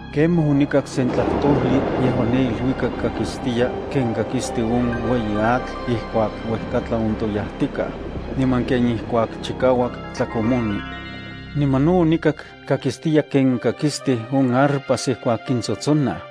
Kemaj onikak sen tlajtojli yejuan ne iluikak kakistiya ken kakisti on ueyi atl ijkuak uejkatlan ontoyajtikaj, niman ken ijkuak chikauak tlakomoni. Niman no onikak kakistiya ken kakistij on arpas ijkuak kintsotsonaj.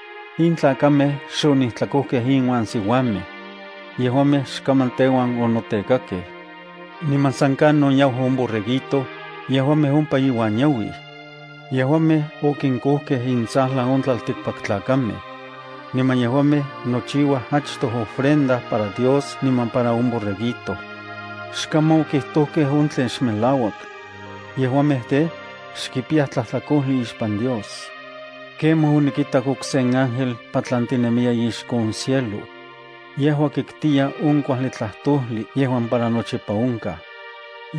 In tlakamej xonijtlakojkej inuan siuamej. Yejuamej xkaman teuan onotekakej. Niman san kanon yau on Borreguito, yejuamej ompa iuan yauij. Yejuamej okinkojkej intsajlan on tlaltikpaktlakamej. Niman yejuamej nochiuaj achtoj ofrenda para Dios niman para on Borreguito. Xkaman okijtojkej on tlen xmelauak. Yejuamej tej, xkipiyaj tlajtlakojli ixpan Dios. Kemaj onikitak okse ángel patlantinemiya ixko on cielo. Yejua kitkiya on kuajli tlajtojli yejuan para nochipa onkaj.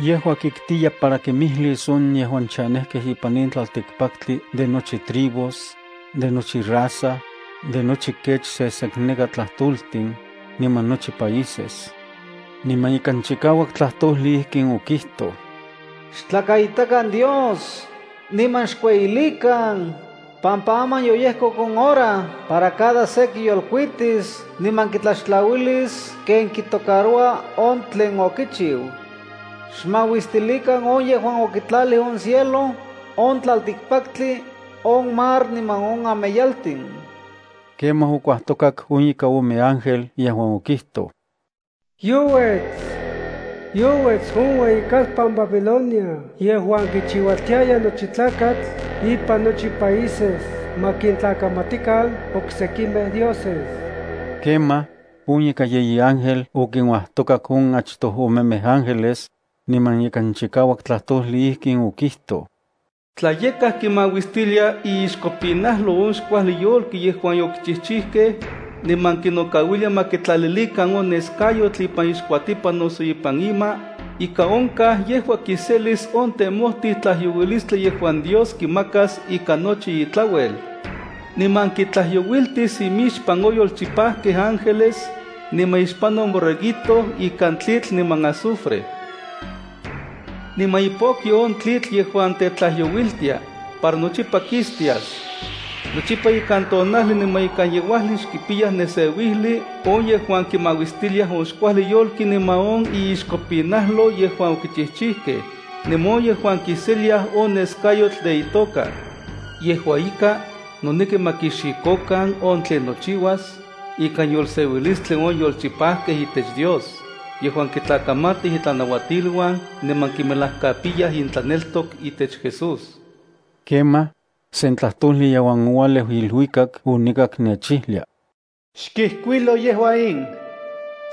Yejua kitkiya para kimijlis on yejuan chanejkej ipan in tlaltikpaktli de nochi tribus, de nochi raza, de nochi kech sesekneka tlajtoltin, niman nochi países. Niman ikan chikauak tlajtojli ijkin okijtoj: “Xtlakaitakan Dios, niman xkueyilikan, pampa aman yoyejkok on hora para cada se kiyolkuitis niman kitlaxtlauilis ken kitocaroua on tlen okichiu. Xmauistilikan on yejuan okitlalij on cielo, on tlaltikpaktli, on mar niman on ameyaltin.” Kemaj okuajtokak on ika ome ángel yejuan okijtoj: “¡Youets! ¡Youets on ueyikalpan Babilonia yejuan kichiualtiaya nochi tlakatl ipan nochi países ma kintlakamatikan oksekimej dioses!” Kemaj, on ika yeyi ángel okinuajtokak on achtoj omemej ángeles, niman ikan chikauak tlajtojli ijkin okijtoj: “Tla yakaj kimauistilia iixkopinalo on xkuajli yolki yejuan okichijchijkej, niman kinokauilia ma kitlalilikan on neskayotl ipan ixkuatipan noso ipan ima, ika onkaj yejua kiselis on temojtij tlajyouilistli yejuan Dios kimakas ikan nochi itlauel. Niman kitlajyouiltis imixpan on yolchipajkej ángeles, niman ixpan on Borreguito ikan tlitl niman azufre. Niman ipokyo on tlitl yejuan tetlajyouiltia, para nochipa kistias. Nochipa ikan tonajli niman ikan yeuajli xkipiyaj neseuijli on yejuan kimauistiliaj on xkuajli yolki niman on iixkopinajlo yejuan okichijchijkej, niman on yejuan kiseliaj on neskayotl de itoka.” Yejua ika, noneki ma kixikokan on tlen nochiuas, ikan yolseuilistli on yolchipajkej itech Dios, yejuan kitlakamatij itlanauatiluan niman kimelajkapiyaj intlaneltok itech Jesús. Kemaj, sen tlajtojli yejuan oualeu iluikak onikak nechijlia: —Xkijkuilo yejua in: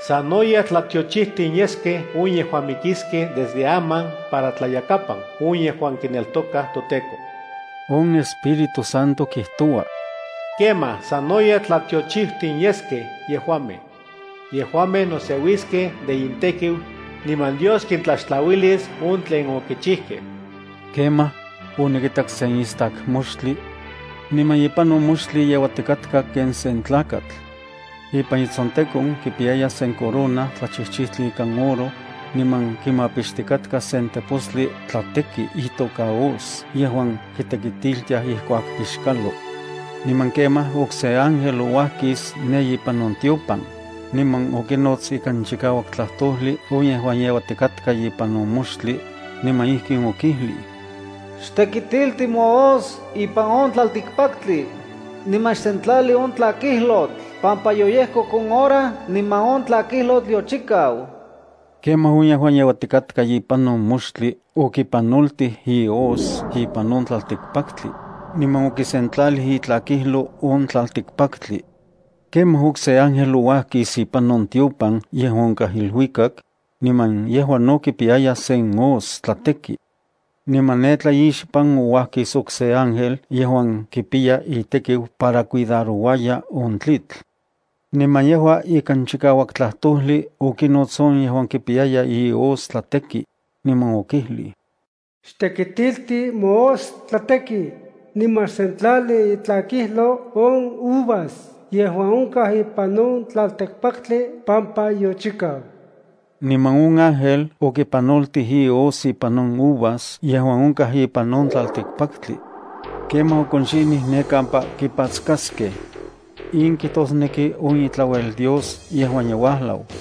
“Sanoyej tlatiochijtin yeskej on yejuan mikiskej desde aman para tlayakapan on yejuan kineltokaj toTEKO.” On Espíritu Santo kijtoua: “¡Kemaj, sanoyej tlatiochijtin yeskej yejuamej! Yejuamej noseuiskej de intekiu, niman Dios kintlaxtlauilis on tlen okichijkej.” Kemaj, onikitak sen istak moxtli. Niman ipan on moxtli yeuatikatka ken sen tlakatl. Ipan itsontekon kipiyaya sen corona tlachijchijtli ikan oro, niman kimapixtikatka sen tepostli tlateki itoka hoz yejuan kitekitiltiaj ijkuak pixkalo. Niman kemaj okse ángel ouajkis ne ipan on tiopan, niman okinots ikan chikauak tlajtojli on yejuan yeuatikatka ipan on moxtli, niman ijkin okijlij: “Xtekitilti mohoz ipan on tlaltikpaktli, niman xsentlali on tlakijlotl pampa yoyejkok hora niman on tlakijlotl yochikau.” Kemaj on yejuan yeuatikatka ipan on moxtli okipanoltij ihoz ipan on tlaltikpaktli, niman okisentlalij itlakijlo on tlaltikpaktli. Kemaj okse ángel ouajkis ipan on tiopan yejuan onkaj iluikak, niman yejua no kipiyaya sen hoz tlateki. Niman ne tlaixpan ouajkis okse ángel yejuan kipiya itekiu para cuidarouaya on tlitl. Niman yejua ikan chikauak tlajtojli okinots on yejuan kipiyaya ihoz tlateki, niman okijlij: “Xtekitilti mohoz tlateki, niman xsentlali itlakijlo on uvas yejuan onkaj ipan on tlaltikpaktli pampa yochikau.” Niman on ángel okipanoltij ihoz ipan on uvas yejuan onkaj ipan on tlaltikpaktli. Kemaj okonxinij ne kampa kipatskaskej. In kijtosneki on itlauel Dios yejuan ye uajlau.